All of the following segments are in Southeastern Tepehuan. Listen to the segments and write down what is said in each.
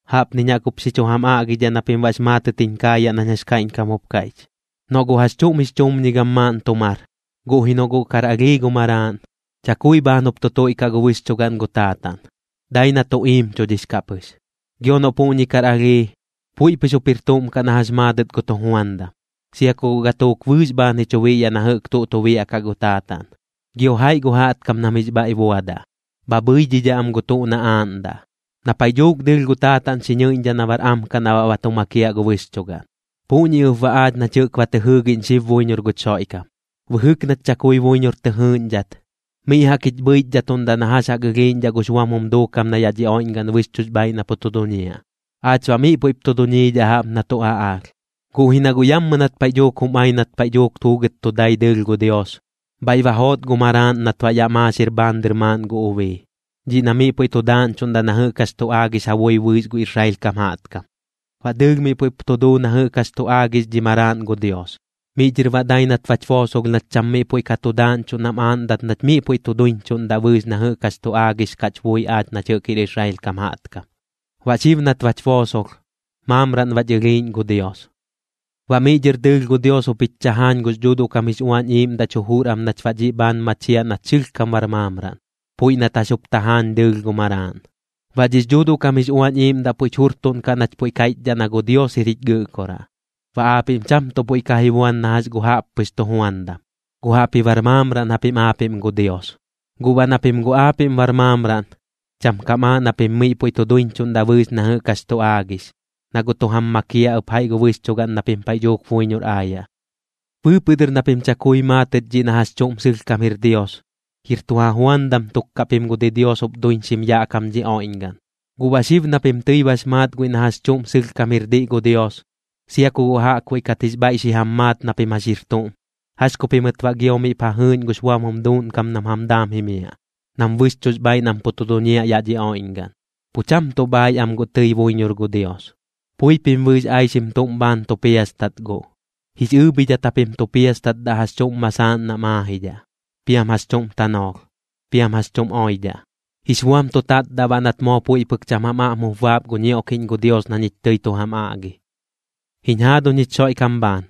Jaꞌpniñ jaꞌk jup xi chu jam aꞌgidhaꞌ na pim baꞌx maatɨt jiñ kaayaꞌ nañ jax kaiꞌñkam jup kaiꞌch. Noꞌ gu jax chuꞌm jix chumñigam maaꞌn tu mar, guꞌ ji noꞌ guꞌ kar alhii gu maraaꞌn, chakui bhaan jup tu tuiꞌkaꞌ gu bɨxchugaꞌn gu taataꞌn, dai na tu iimchudhix kaꞌ pɨx. Gio noꞌ puꞌñi kar alhii, puiꞌ pɨx jup jir tuꞌm kaꞌ na jax maadɨt gu tujuandam, sia ku guꞌ gatuuk bɨɨx bhaan ji chu biꞌyaꞌ na jɨꞌk tuꞌ tu biaꞌkaꞌ gu taataꞌn. Gio jaiꞌ gu jaꞌtkam nam jix bhaiꞌ buadaꞌ, bha bhɨidhidhaꞌ am gu tuꞌ na aaꞌndaꞌ. Na paiꞌ dhuuk dɨɨlh gu taataꞌn xi ñɨɨꞌñdhaꞌ na bar am kaꞌ na baꞌ ba tu makiaꞌ gu bɨxchugaꞌn. Puꞌñi ɨp baꞌ aach nach jɨꞌk ba tɨ jɨɨgiꞌñ xib buiñor guch Xoiꞌkam. Bɨjɨk nach chakui buiñor tɨ jɨɨꞌñdhat, miꞌ jaꞌk jich bhɨichdhatuꞌndaꞌ na jax jaꞌk ɨlhiiꞌñdhaꞌ gux buam jum duukam na yaꞌ dhi oiꞌñgaꞌn bɨxchuꞌx bhaaiꞌ na pu tu duñiaꞌ, aach baꞌ miꞌ puiꞌp tu duñiidhaꞌ jaꞌp na tuꞌ aꞌaalh. Guꞌ ji na guꞌ yammɨ nat paiꞌ dhuuk jum ai nat paiꞌ pɨx juugɨt tu dai dɨɨlh gu Dios, bhaiꞌ ba joot gu Maraaꞌn nat baꞌ yaꞌ maaxir bhaan dɨr maaꞌn gu ubii, dhiꞌ na miꞌ puiꞌ tu daaꞌñchuꞌndaꞌ na jɨꞌk jax tu aagix ja bui bɨɨx gu Israel kam jaꞌtkam. Baꞌ dɨɨlh miꞌ puiꞌp tu duu na jɨꞌk jax tu aagix dhi Maraaꞌn gu Dios, miꞌ dhɨr baꞌ dai nat bach boosolh nach cham miꞌ puiꞌ ka tu daaꞌñchuꞌ nam aaꞌndat nach miꞌ puiꞌ tu duiñchuꞌndaꞌ bɨɨx na jɨꞌk jax tu aagix kaꞌch bui aach nach jɨꞌk jir Israel kam jaꞌtkam. Baꞌ xib nat bach boosolh, maamraꞌn bach ɨlhiiꞌñ gu Dios. Baꞌ miꞌ dhɨr dɨɨlh gu Dios jup jich chajaañ gux Dhuuduꞌ kam jix Uañ Iiꞌmdaꞌch jujur am nach baꞌ dhiꞌ bhaan machiaꞌ nach sɨlhkam bar maamraꞌn, puiꞌ nat jax jup tajaañ dɨɨlh gu Maraaꞌn. Baꞌ dhix Dhuuduꞌ kam jix Uañ Iiꞌmdaꞌ puiꞌch jurtuꞌnkaꞌ nach puiꞌ kaiꞌchdhaꞌ na gu Dios jir jich Gɨꞌkoraꞌ. Baꞌ aapiꞌm cham tuꞌ puiꞌ ka ji buan na jax gu jaꞌppɨx tujuandam, guꞌ jaꞌpji bar maamraꞌn japim aapiꞌm gu Dios. Guꞌ baꞌ na pim guꞌ aapiꞌm bar maamraꞌn, cham kam aaꞌ na pim miꞌ puiꞌ tu duiñchuꞌndaꞌ bɨɨx na jɨꞌk jax tu aagix, na guꞌ tu jam makiaꞌ ɨp jaiꞌ gu bɨxchugaꞌn na pim paiꞌ dhuuk buiñor aayaꞌ. Bɨɨpɨꞌ dɨr na pim chakui maatɨt dhiꞌ na jax chuꞌm sɨlhkam jir Dios, jir tu ja juandam tuk kaꞌ pim gu didios jup duiñxim yaꞌ kam dhi oiꞌñgaꞌn. Guꞌ baꞌ xib na pim tɨi bax maat guiꞌ na jax chuꞌm sɨlhkam jir diꞌ gu Dios, sia ku guꞌ jaꞌkbuiꞌ kat jix bhaiꞌ xi jam maat na pim jax jir tuꞌm, ¿jax ku pimɨt baꞌ gio miꞌp ja jɨɨꞌñ gux buam jum duuꞌnkam nam jam daam jimiaꞌ, nam bɨxchuꞌx bhaaiꞌ nam pu tu duñiaꞌ yaꞌ dhi oiꞌñgaꞌn? Pu cham tuꞌ bhaaiꞌ am guꞌ tɨi buiñor gu Dios. Pui pim bɨɨx aixim tuꞌm bhaan tu piastat guꞌ, jix ɨɨbhidhat japim tu piastatdaꞌ jax chuꞌm masaaꞌn nam aajidhaꞌ, piam jax chuꞌm tanoolh, piam jax chuꞌm oidhaꞌ. Jix buam tu tatdaꞌ baꞌ nat moo puiꞌ pɨk cham jam aꞌm jup baap gu ñioꞌkiꞌñ gu Dios na ñich tɨi tu jam aꞌgi. Jiñ jaaduñ jich Xoiꞌkam bhaan,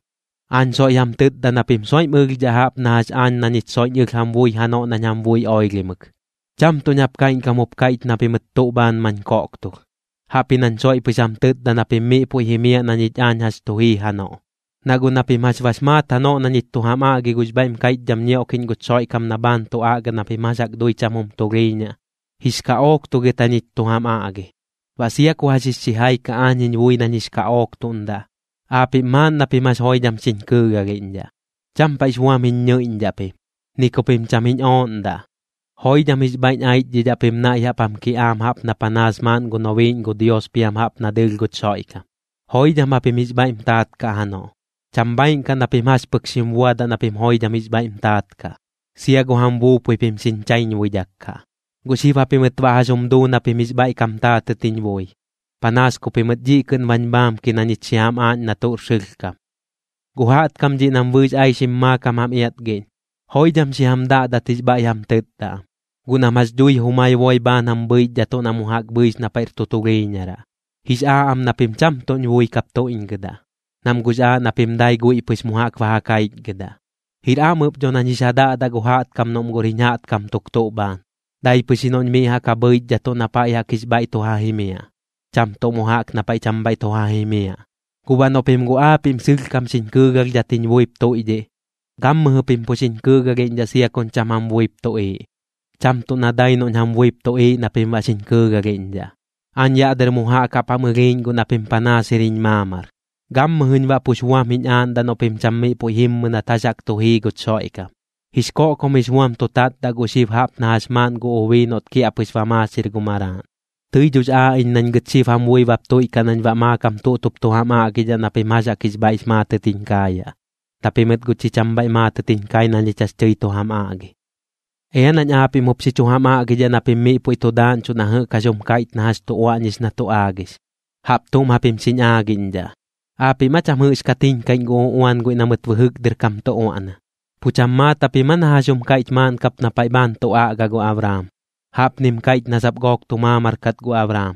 aañ soiꞌ jam tɨtda na pim soiꞌm ɨlhdhaꞌ jaꞌp na jax aañ na ñich soiꞌñ ɨlh jam bui janoꞌ nañ jam bui oilhimɨk. Cham tuꞌñ jaꞌp kaiꞌñkam jup kaiꞌch na pimɨt tuꞌ bhaan mañ koꞌktulh, jaꞌpji nañ soiꞌ pɨx jam tɨtda na pim miꞌ puiꞌ jimiaꞌ na ñich aañ jax tu jii janoꞌ. Na guꞌ na pim jax bax maat janoꞌ na ñich tu jam aꞌgi gux bhaiꞌm kaiꞌchdham ñioꞌkiꞌñ guch Xoiꞌkam na bhaan tu aꞌga na pim jax jaꞌk dui cham jum tulhiiñaꞌ, jix kaꞌooktugɨt jañich tu jam aꞌgi. Baꞌ sia ku jax jix xijai kaꞌ aañ jiñ bui nañ jix kaꞌooktuꞌndaꞌ, aapiꞌm maaꞌn na pim jax joidham xiñ kɨɨgalhiꞌñdhaꞌ, cham paiꞌx buam jiñ ñɨiꞌñdhaꞌ pim, ni ku pim cham jiñ ooꞌndaꞌ. Joidham jix bhaiꞌñ aichdhidhaꞌ pim naiꞌ jaꞌp jam kiꞌaam jaꞌp na panaas maaꞌn gu nobiiꞌñ gu Dios piam jaꞌp na dɨɨlh guch Xoiꞌkam. Joidham japim jix bhaiꞌm taat kaꞌ janoꞌ, cham bhaaiꞌn kaꞌ na pim jax pɨk xim buadaꞌ na pim joidham jix bhaiꞌm taat kaꞌ. Sia gu jam buupui pim xiñ chaiñbuidhak kaꞌ. ¿Guꞌ xib japimɨt baꞌ jax jum duu na pim jix bhaiꞌ kam taatɨt jiñ bui? Panaas ku pimɨt dhiꞌ kɨꞌn bañ bhaamki na ñich xi jam aaꞌñ na tuꞌr sɨlhkam. Gu jaꞌtkam dhiꞌ nam bɨɨx aixim maakam jam iatgiꞌñ, joidham xi jam daꞌdat jix bhaiꞌ jam tɨtda am, guꞌ nam jax dhui jumai boi bhaan jam bhɨichdhatuꞌ na mu jaꞌk bhɨix na paiꞌr tu tulhiiñaraꞌ. Jix aaꞌ am na pim cham tuꞌñ bui kap tuiꞌñgɨdaꞌ, nam guꞌx aaꞌ na pim dai guiꞌ pɨx mu jaꞌk ba ja kaichgɨdaꞌ. Jir am ɨp dho nañ jix ja daꞌdaꞌ gu jaꞌtkam noꞌm guꞌr jiñ jaꞌtkam tuk tuꞌ bhaan, dai pɨx ji noꞌñ miꞌ jaꞌk ja bhɨichdhatuꞌ na paiꞌ jaꞌk jix bhaiꞌ tu ja jimiaꞌ, cham tuꞌ mu jaꞌk na paiꞌ cham bhaiꞌ tu ja jimiaꞌ. Guꞌ baꞌ noꞌ pim guꞌ aapiꞌm sɨlhkam xiñ kɨɨgalhdhat jiñ buip tuiꞌdhiꞌ, gammɨjɨ pim pu xiñ kɨɨgalhiꞌñdhaꞌ sia kuñ cham jam buip tuꞌiiꞌ, cham tuꞌ na dai noꞌñ jam buip tuꞌiiꞌ na pim baꞌ xiñ kɨɨgalhiꞌñdhaꞌ. Aañ yaꞌ dɨr mu jaꞌk jaꞌp jam ɨlhiiꞌñ guꞌ na pim panaas jir jiñ maamar, gammɨjɨñ baꞌ pux buam jiñ aaꞌndaꞌ noꞌ pim cham miꞌ puiꞌ jimmɨ nat jax jaꞌk tu jii guch Xoiꞌkam, jix koꞌkom jix buam tu tatdaꞌ guꞌ xib jaꞌp na jax maaꞌn gu ubii noꞌt kiaꞌpɨx ba maaxir gu maraaꞌn. Tɨi dhox aaꞌ iñ nañ gɨt xib jam bui bap tuiꞌkaꞌ nañ baꞌ maakam tuꞌt jup tu jam aꞌgidhaꞌ na pim jax jaꞌk jix bhaiꞌx maatɨt jiñ kaayaꞌ, na pimɨt guꞌ chi cham bhaiꞌ maatɨt jiñ kai na ñich jax tɨi tu jam aꞌgi. Ea nañ aapiꞌm jup xi chu jam aꞌgidhaꞌ na pim miꞌ puiꞌ tu daaꞌñchuꞌ na jɨꞌk jax jum kaiꞌch na jax tu uaꞌñix na tu aagix. Jaꞌp tuꞌm japim xiñ aagiꞌñdhaꞌ: ¿Aapiꞌm aa cham jɨꞌxkat jiñkaiꞌñ gu uꞌuan guiꞌ na mɨt bɨjɨk dɨr kam tu uaꞌna? ¿Pu cham maat japim aa na jax jum kaiꞌch maaꞌn kap na paiꞌ bhaan tu aꞌga gu Abraam? Jaꞌpnim kaiꞌch na sap gook tu maamar kat gu Abraam,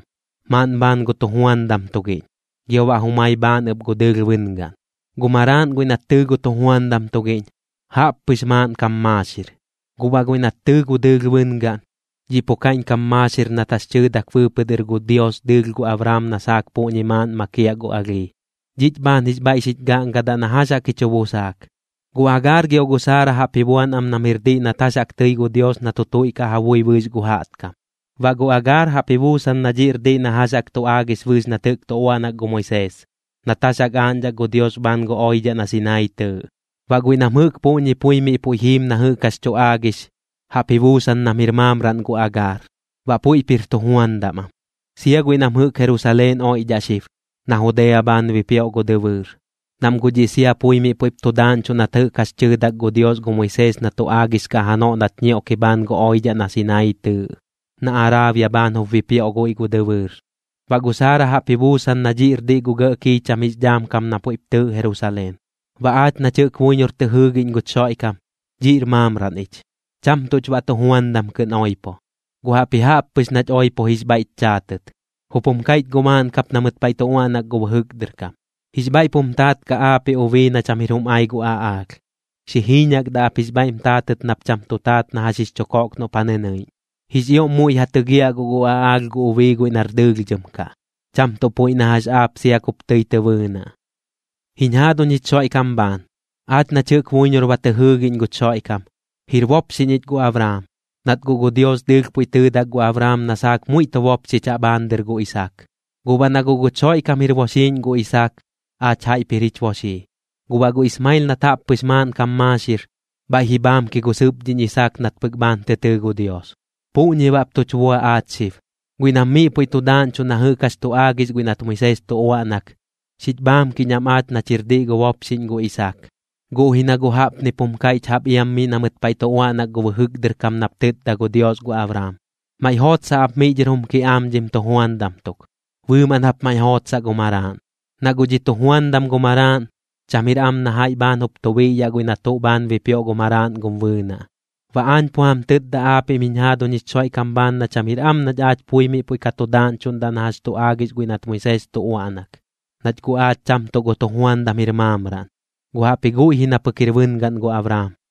maaꞌn bhaan gu tujuandam tugiꞌñ, gio baꞌ jumai bhaan ɨp gu dɨɨlh bɨngaꞌn. Gu maraaꞌn guiꞌ nat tɨɨ gu tujuandam tugiꞌñ, jaꞌppɨx maaꞌnkam maaxir. Guꞌ baꞌ guiꞌ nat tɨɨ gu dɨɨlh bɨngaꞌn, dhiꞌ pu kaiꞌñkam maaxir nat jax tɨɨdak bɨɨpɨꞌ dɨr gu Dios dɨɨlh gu Abraam na saak puꞌñi maaꞌn makiaꞌ gu alhii. Dhiꞌch bhaan jix bhaiꞌ xich gaꞌngadaꞌ na jax jaꞌk ji chu busaak. Gu Agaar gio gu Saara jaꞌp ji buan am nam jir diꞌ nat jax jaꞌk tɨi gu Dios na tu tuiꞌkaꞌ ja bui bɨɨx gu jaꞌtkam. Baꞌ gu Agaar jaꞌp ji buusan na dhiꞌr diꞌ na jax jaꞌk tu aagix bɨɨx nat jɨꞌk tu uaꞌnak gu Moisees, nat jax aaꞌñdhak gu Dios bhaan gu oidhaꞌ na Sinaii tɨɨꞌ. Baꞌ guiꞌ nam jɨꞌk puꞌñi pui miꞌ puiꞌ jiim na jɨꞌx jax tu aagix, jaꞌp ji buusan nam jir maamraꞌn gu Agaar, baꞌ puiꞌp jir tujuandam am. Sia guiꞌ nam jɨꞌk Jerusaleen oiꞌdhaꞌ xib, na Judea bhaan bipioꞌ gu dɨbɨɨr, nam guꞌ dhiꞌ sia pui miꞌ puiꞌp tu daaꞌñchuꞌ nat jɨꞌk jax tɨɨdak gu Dios gu Moisees na tu aagix kaꞌ janoꞌ nat ñioꞌki bhaan gu oidhaꞌ na Sinaii tɨɨꞌ, na Araabia bhaan jup bipioꞌ guiꞌ gu dɨbɨɨr. Baꞌ gu Saara jaꞌp ji buusan na dhiꞌr diꞌ gu gɇꞌ kiicham jix dhaam kam na puiꞌp tɨɨꞌ Jerusaleen. Baꞌ aach nach jɨꞌk buiñor tɨ jɨɨgiꞌñ guch Xoiꞌkam, dhiꞌr maamraꞌn ich. Cham tuꞌch baꞌ tujuandam kɨꞌn oipo, guꞌ jaꞌpji jaꞌp pɨx nach oipo jix bhaiꞌch chaatɨt. Jup jum kaiꞌch guꞌ maaꞌn kap na mɨt paiꞌ tu uaꞌnak gu bɨjɨk dɨr kam: Jix bhaiꞌp jum taat kaꞌ aapiꞌ ubii na cham jir jum ai gu aꞌaalh. Xi jiiñakdaꞌ ap jix bhaiꞌm taatɨt nap cham tu taat na jax jix chu koꞌk noꞌp ja nɨnɨiꞌñ. Jix ioꞌm muiꞌ ja tɨgiaꞌ guꞌ gu aꞌaalh gu ubii guiꞌ nar dɨlhdhɨm kaꞌ, cham tuꞌ puiꞌ na jax aap sia kup tɨi tɨ bɨɨnaꞌ. Jiñ jaaduñ jich Xoiꞌkam bhaan, aach nach jɨꞌk buiñor ba tɨ jɨɨgiꞌñ guch Xoiꞌkam, jir bopxiꞌñ ich gu Abraam, nat guꞌ gu Dios dɨɨlh puiꞌ tɨɨdak gu Abraam na saak muiꞌ tu bopxichaꞌ bhaan dɨr gu Isaak. Guꞌ baꞌ na guꞌ guch Xoiꞌkam jir boxiiꞌñ gu Isaak, aach jaiꞌp jir jich boxii. Guꞌ baꞌ gu Ismael nat jaꞌppɨx maaꞌnkam maaxir, bhaiꞌ ji bhaamki gu sɨpdhiꞌñ Isaak nat pɨk bhaan tɨ tɨɨ gu Dios. Puꞌñi bap tuch bua aach xib, guiꞌ nam miꞌ puiꞌ tu daaꞌñchuꞌ na jɨꞌk jax tu aagix guiꞌ nat Moisees tu uaꞌnak, xich bhaamkiꞌñ am aach nach jir diꞌ gu bopxiꞌñ gu Isaak. Guꞌ ji na guꞌ jaꞌpnip jum kaiꞌch jaꞌp iam miꞌ na mɨt paiꞌ tu uaꞌnak gu bɨjɨk dɨr kam nap tɨtda gu Dios gu Abraam: “Maiꞌ jootsaꞌ ap miꞌ dhɨr jum kiꞌaam dhim tujuandam tuk, bɨɨmaꞌn jap maiꞌ jootsaꞌ gu maraaꞌn. Na guꞌ dhi tujuandam gu maraaꞌn, cham jir am na jaiꞌ bhaan jup tu biꞌyaꞌ guiꞌ na tuꞌ bhaan bipioꞌ gu maraaꞌn gum bɨɨnaꞌ.” Baꞌ aañ pu jam tɨtda aapiꞌm jiñ jaaduñ jich Xoiꞌkam bhaan na cham jir am nach aach pui miꞌ puiꞌ ka tu daaꞌñchuꞌndaꞌ na jax tu aagix guiꞌ nat gu Moisees tu uaꞌnak, nach guꞌ aach cham tuꞌ gu tujuandam jir maamraꞌn, guꞌ jaꞌpji guiꞌ ji na pɨk jir bɨngaꞌn gu Abraam.